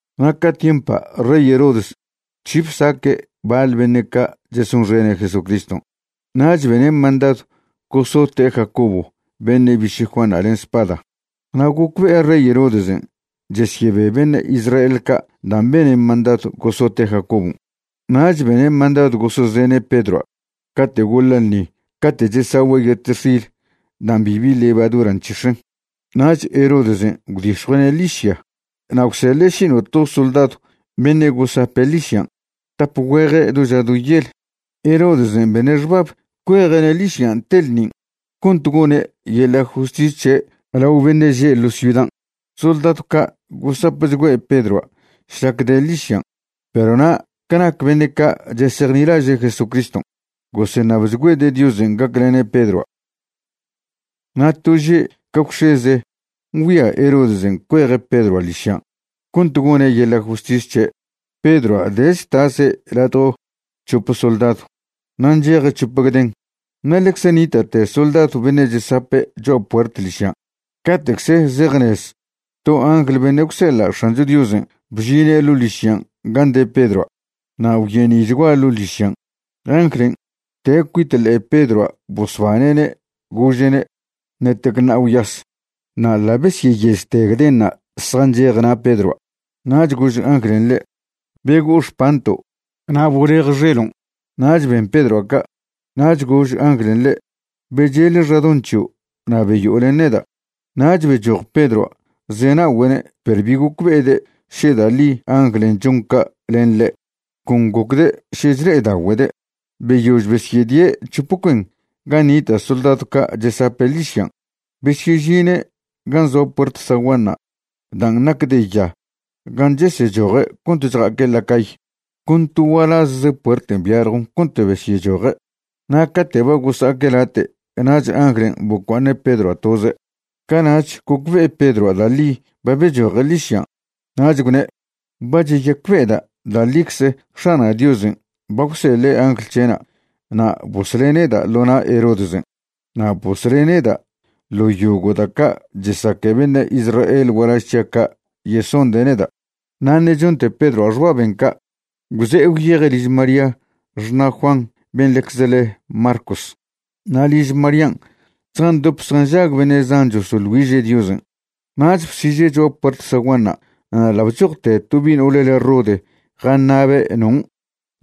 Na' ca tiempa' rey Herodes bc̱hi bsaque' baḻ beṉe' ca' chesonxene' Jesucriston'. Nach bene' mandadw gosote' Jacobo beṉe' biše' Juanṉa' len spada. Na' gocbe'e rey Herodesen' chesyebe beṉe' Israel ca' dan' bene' mandadw gosote' Jacobon', nach bene' mandadw gosezene' Pedroa' cate' goḻa' ḻṉi cate' chesagüe' yetextil dan' bibi levadura nc̱hix̱en. Nach Herodesen' gwdix̱jue'ene' ḻižya na' gwseḻe' šino'to soldadw beṉe' gosape' ḻižyan', tap güeje' do ža do yel. Herodesen' bene' xbab cueje'ne' ḻižyan' te ḻṉin' cont gone' yeḻa' justis c̱he' lao beṉe' že' ḻo ciudan'. Soldadw ca' gosapchgüe' Pedroa' šlac de' ḻižyan', perw na' ca nac beṉe' ca' chesejnilaže' Jesucriston', goseṉabchgüede' Diosen' gaclene' Pedroa'. Na' to že' ca gwx̱eze ngüia Herodesen' cueje' Pedroa' ḻižyan' cont gone' yeḻa' justis c̱he', Pedroa' de' chtase' ladjo c̱hope soldadw na' ncheje' c̱hope gden, na' ḻecze nita'te soldadw beṉe' chesape' cho'a puert ḻižyan'. Cate'cze zejzenez to angl beṉe' gwseḻa' X̱ancho Diosen' bžine' ḻo' ḻižyan' gan' de Pedroa' na' gwyeni'chgua ḻo' ḻižyan'. Anglen' bte' cuit ḻe'e Pedroa' bosbane'ne', gože'ne': ―Ṉetec ṉa'a gwyas. Na' ḻa' besyeyežte gdenṉa' zjanchej na' Pedroa'. Nach gož anglen' ḻe': ―Bego'o xpanto' na' bolej xelon'. Nach ben Pedroa' ca'. Nach gož anglen' ḻe': ―Becheḻe xadoṉ c̱hio' na' beyo'o len neda'. Nach bechoj Pedroa' zena'ogüe'ne' perw bi gocbe'ede' še da' ḻi anglen' chon ca' len ḻe', con gocde' še chle'edagüede'. Beyož besyedie' c̱hop cuen gan' nita' soldadw ca' chesape' ḻižyan', besyežine' gan' zoa puert zaguanṉa' dan' nac de ya gan' chesechoje' cont chja'aque' la cay, con to gualazze puerten' byaljon cont besyechoje', na' cate' ba gosa'aque' late' nach anglen' bocua'aṉe' Pedroa' toze'. Cana'ch gocbe'e Pedroa' da' ḻi ba bechoje' ḻižyan', nach gwne': ―Ba cheyacbe'eda' da' ḻicze X̱ana' Diosen' ba gwseḻe' angl c̱he'na' na' bosle' neda' ḻo na' Herodesen' na' bosle' neda' ḻo yogo' da' ca' chesaque beṉe' Israel gualaž c̱hia' ca' yesonde' neda'. Na' ṉe' chonte Pedroa' xbaben' ca', gwze'e gwyeje' liž María xṉa' Juan ben' ḻecze le Marcos. Na' liž Marían' zjandop zjanžag beṉe' zan chosoḻ güiže' Diosen'. Nach bsiže' cho'a puert zaguanṉa' na' ḻa' bchojte to bi' no'ole le Rode jaṉa'be' non'.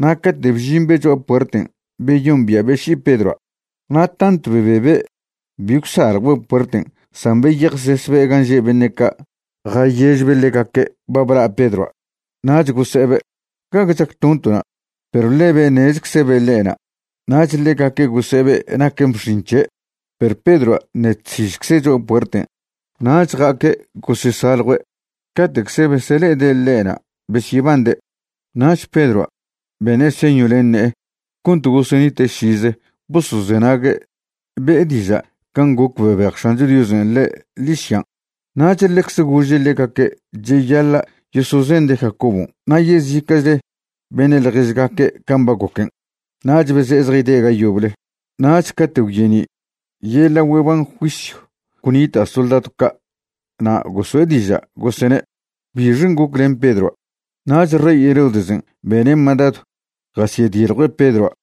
Na' cate' bžimbe' cho'a puerten' beyombia'be' ši'i Pedroa', na' tantw bebebe' bi gwsaljwbe' puerten' san beyejsesbe' gan' že' beṉe' ca' jayežbe' ḻegaque' ba bla' Pedroa'. Nach gose'ebe': ―¿Gague chactonto'na'? Perw ḻebe' ṉezczebe' ḻe'na'. Nach ḻegaque' gose'ebe' naquen bx̱in c̱he'. Perw Pedroa' ṉe' chsižcze' cho'a puerten'. Nach ja'aque' gosesaljue'. Cate'cze besele'ede' ḻe'na' besyebande'. Nach Pedroa' bene' señw len ne'e cont gosenite' šize bosozenague' be'e diža' can' goc bebej X̱ancho Diosen' ḻe' ḻižyan'. Nach ḻecze gože' ḻegaque' cheyaḻa' yosozende' Jacobon' na' yezica'chle beṉe' ḻježgaque' can' ba goquen'. Nach beze'e zjayde' ga yoble. Nach cate' gwyeni', yeḻa' güeban juisyw gwnita' soldadw ca' na' goso'e diža', gosene': ―¿Bixen' goc len Pedroa'? Nach rey Herodesen' bene' mandadw jasyediljue' Pedroa'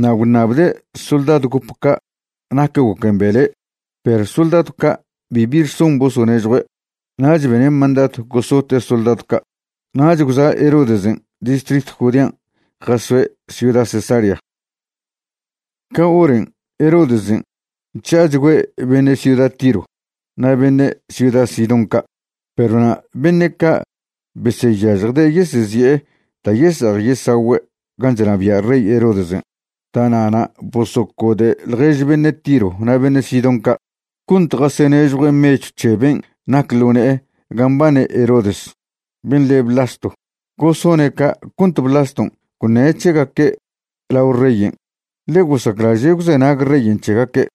na' gwṉabde' soldadw gop ca' nac goquen' bele'. Perw soldadw ca' bibi rson bosonežjue'. Nach bene' mandadw gosote' soldadw ca'. Nach gwza' Herodesen' distritw Judean' jazoe' ciuda Cesarea. Ca horan' Herodesen' chža'achgüe' beṉe' ciuda Tiro na' beṉe' ciuda Sidón ca'. Perw na' beṉe' ca' beseyažjde' yesezi'e da' yese'ej yesagüe' gan' chnabia' rey Herodesen'. Da'na'na' bosocode' ḻjež beṉe' Tiro na' beṉe' Sidón ca' cont jasenežjue' mechw c̱he ben' nac ḻo ne'e gan' mbane Herodes, ben' le' Blasto. Gosone' ca' cont Blaston' gwṉe' c̱hegaque' lao reyen', ḻe gosaclaže' gwzenag reyen' c̱hegaque'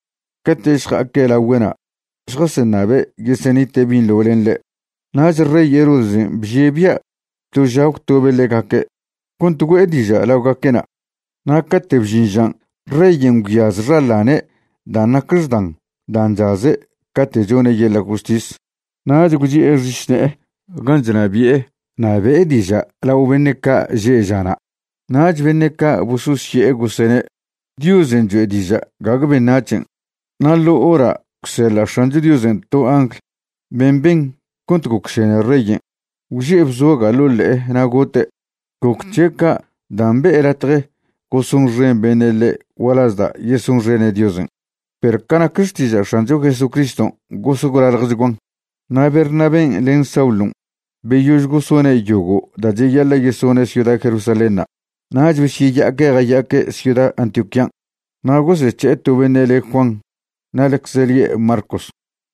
cate' šja'aque' lagüe'na' šjaseṉabe' yesenite' binḻo len ḻe'. Nach rey Herodesen' bžie' bia' to ža gwtobe' ḻegaque' cont güe'e diža' laogaque'na'. Na' cate' bžin žan', reyen' gwyaz xaḻane' dan' nac xdan dan' chaze' cate' chone' yeḻa' justis, nach gwchi'e xišne'e gan' chnabi'e na' be'e diža' lao beṉe' ca' že' žana'. Nach beṉe' ca' bososye'e, gosene': ―Diosen' choe' diža', gague beṉac̱hen'. Na' ḻo hora' gwseḻa' X̱ancho Diosen' to angl ben' ben cont gocšene reyen' gwže'e bzoga' ḻo' ḻe'e na' gote'. Goc c̱he' ca' dan' be'e latje gosonxen beṉe' ḻe' gualaz da' yesonxene' Diosen'. Perw ca nac xtiža' X̱ancho Jesucriston' gos gwlaḻjchguan. Na' Bernabén' len Saulon' beyož gosone' yogo' da' cheyaḻa' yesone' ciuda Jerusalénṉa', nach besyeya'aque' jaya'aque' ciuda Antioquían'. Na' gosec̱he'e to beṉe' le Juan na' ḻecze lie' Marcos.